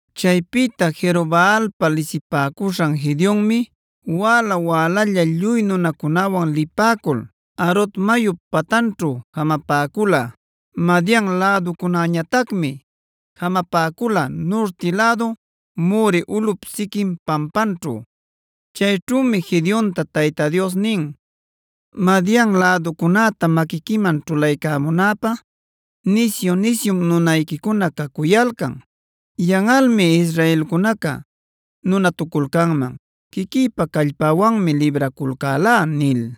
Chaypïta Jerobaalpa lisipäcuśhan Gedeonmi wäla-wälalla lluy nunancunawan lipäcul Harod mayup patanćhu jamapäcula. Madian läducunäñatacmi jamapäcula nurti lädu More ulꞌup siquin pampanćhu. Chayćhümi Gedeonta Tayta Dios nin: “Madian läducunäta maquiquiman ćhulaycamunäpä nisyu-nisyum nunayquicuna cacuyalcan. Yanꞌalmi israelcunaca nunatuculcanman ‘quiquïpa callpäwanmi libraculcälá’ nil.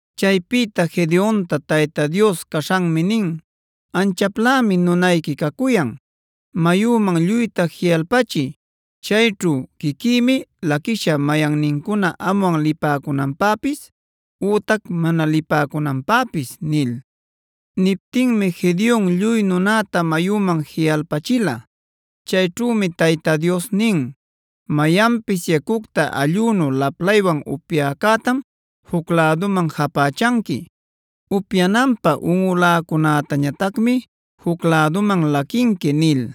Chaypïta Gedeonta Tayta Dios caśhanmi nin: “Anchaplämi nunayqui cacuyan. Mayuman lluyta jiꞌalpachiy. Chayćhu quiquïmi laquishä mayannincuna amwan lipäcunanpäpis ütac mana lipäcunanpäpis” nil. Niptinmi Gedeon lluy nunanta mayüman jiꞌalpachila. Chayćhümi Tayta Dios nin: “Mayanpis yacucta allꞌunu laplaywan upyäcätam juc läduman japächanqui. Upyananpä unꞌuläcunätañatacmi juc läduman laquinqui” nil.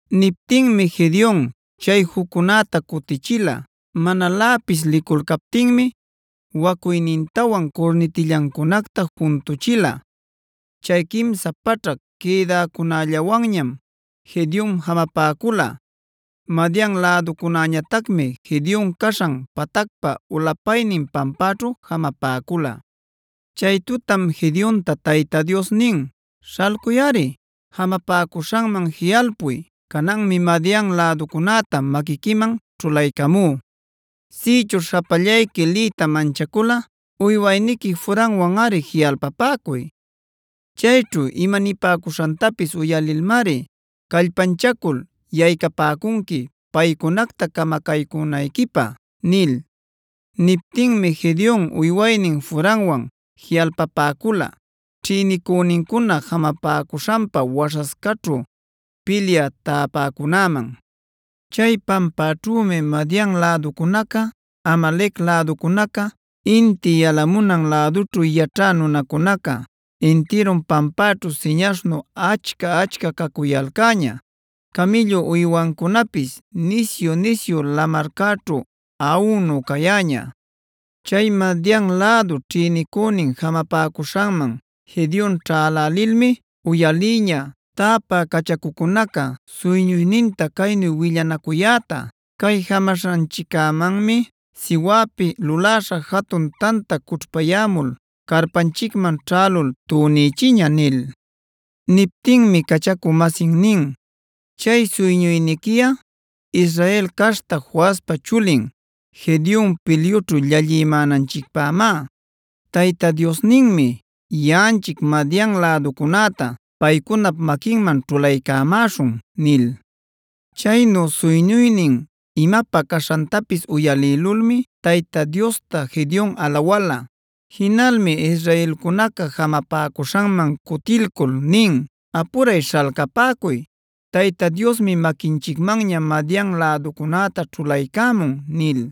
Niptinmi Gedeon chay juccunäta cutïchila; manaläpis liculcaptinmi wacuynintawan curnitillancunacta juntuchila. Chay quimsa paćhac quïdäcunällawanñam Gedeon jamapäcula. Madian läducunäñatacmi Gedeon caśhan patacpa ulapaynin pampäćhu jamapäcula. Chay tutam Gedeonta Tayta Dios nin: “Śhalculꞌari jamapäcuśhanman jiꞌalpuy. Cananmi Madian läducunäta maquiquiman ćhulaycamú. Sïchuśh japallayqui liyta manchaculꞌa uywayniqui Furawanꞌari jiꞌalpapäcuy. Chayćhu imanipäcuśhantapis uyalilmari callpanchacul yaycapäcunqui paycunacta camacaycünayquipä” nil. Niptinmi Gedeon uywaynin Furawan jiꞌalpapäcula ćhïnicünincuna jamapäcuśhanpa waśhascaćhu pilyä tapäcunäman. Chay pampaćhümi Madian läducunaca, Amalec läducunaca, inti yalamunan lädućhu yaćhä nunacunaca intirun pampaćhu siñaśhnu achca-achca cacuyalcäña; camïllu uywancunapis nisyu-nisyu lamarcäćhu aꞌunu cayäña. Chay Madian lädu ćhïnicünin jamapäcuśhanman Gedeon ćhälälilmi uyalïña täpä cachacucunaca suyñuyninta caynu willanacuyäta: “Cay jamaśhanchiccämanmi siwäpi luläśha jatun tanta cućhpayämul carpanchicman ćhälul tunïchiña” nil. Niptinmi cachacu-masin nin: “Chay suyñuyniquiꞌa Israel caśhta Joaspa chulin Gedeon pilyućhu llallimänanchicpämá. Tayta Diosninmi yaꞌanchic Madian läducunäta paycunap maquinman ćhulaycamäśhun” nil. Chaynu suyñuynin imapä caśhantapis uyalïlulmi Tayta Diosta Gedeon alawäla. Jinalmi israelcunaca jamapäcuśhanman cutilcul nin: “Apuray śhalcapäcuy, Tayta Diosmi maquinchicmanña Madian läducunäta ćhulaycämun” nil.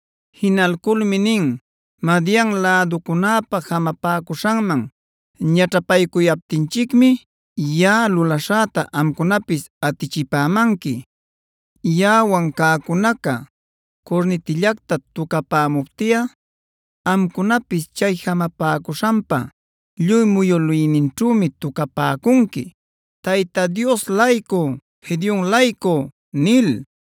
Jinalculmi nin: “Madian läducunäpa jamapäcuśhanman ñaćhapaycuyaptinchicmib yaꞌa lulaśhäta amcunapis atichipämanqui. Yaꞌawan cäcunaca curnitillacta tucapämuptiꞌa amcunapis chay jamapäcuśhanpa lluy muyülïninćhümi tucapäcunqui, jinaman ayaycaćhapäcunqui: ‘¡Tayta Dios-laycu, Gedeon-laycu!’” nil.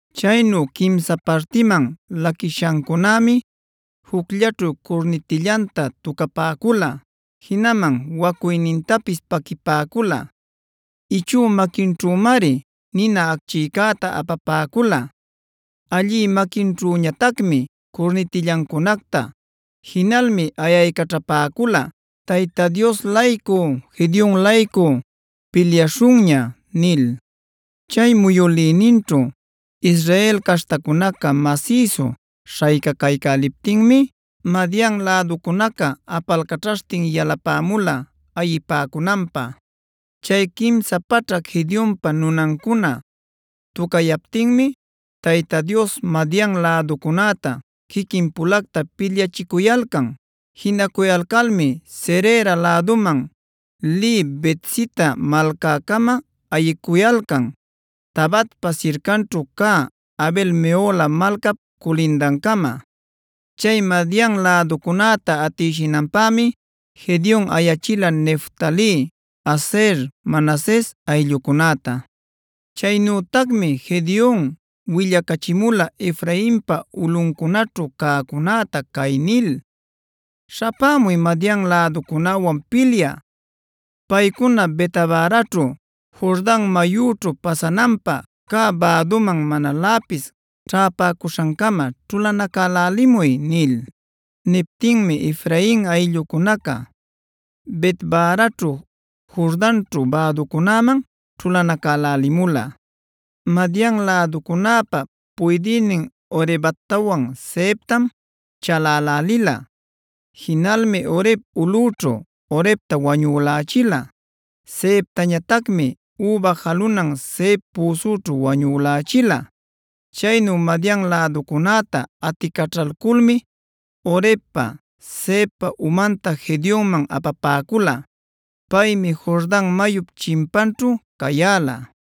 Chaynu quimsa partiman laquishancunämi jucllaćhu curnitillanta tucapäcula, jinaman wacuynintapis paquipäcula. Ichü maquinćhümari nina acchïcäta apapäcula, allï maquinćhüñatacmi curnitillancunacta. Jinalmi ayaycaćhapäcula: “¡Tayta Dios-laycu, Gedeon-laycu pilyaśhunña!” nil. Chay muyülïninćhu Israel caśhtacunaca masïsu śhaycacaycäliptinmi Madian läducunaca apalcachaśhtin yalapämula ayipäcunanpä. Chay quimsa paćhac Gedeonpa nunancuna tucayaptinmi Tayta Dios Madian läducunäta quiquin-pulacta pilyachicuyalcan. Jinacuyalcalmi Zerera läduman lï Bet-sita malcäcama ayicuyalcan, Tabatpa sircanćhu cä Abel-mehola malcap culindancama. Chay Madian läducunäta atïshinanpämi Gedeon ayachila Neftali, Aser, Manases ayllucunäta. Chaynütacmi Gedeon willacachimula Efrainpa ulꞌuncunaćhu cäcunäta cay nil: “Śhapämuy Madian läducunäwan pilyä. Paycuna Bet-baraćhu, Jordan mayućhu pasanapä cä bäduman manaläpis ćhäpäcuśhancama ćhulanacälälimuy” nil. Niptinmi Efrain ayllucunaca Bet-baraćhu, Jordanćhu bäducunäman ćhulanacälälimula. Madian läducunäpa puydïnin Orebtawan, Zeebtam chalälälila. Jinalmi Oreb ulꞌüćhu Orebta wañülächila; Zeebtañatacmi üba jaluna Zeeb püsućhu wañülächila. Chaynu Madian läducunäta aticaćhalculmi Orebpa, Zeebpa umanta Gedeonman apapäcula. Paymi Jordan mayup chimpanćhu cayäla.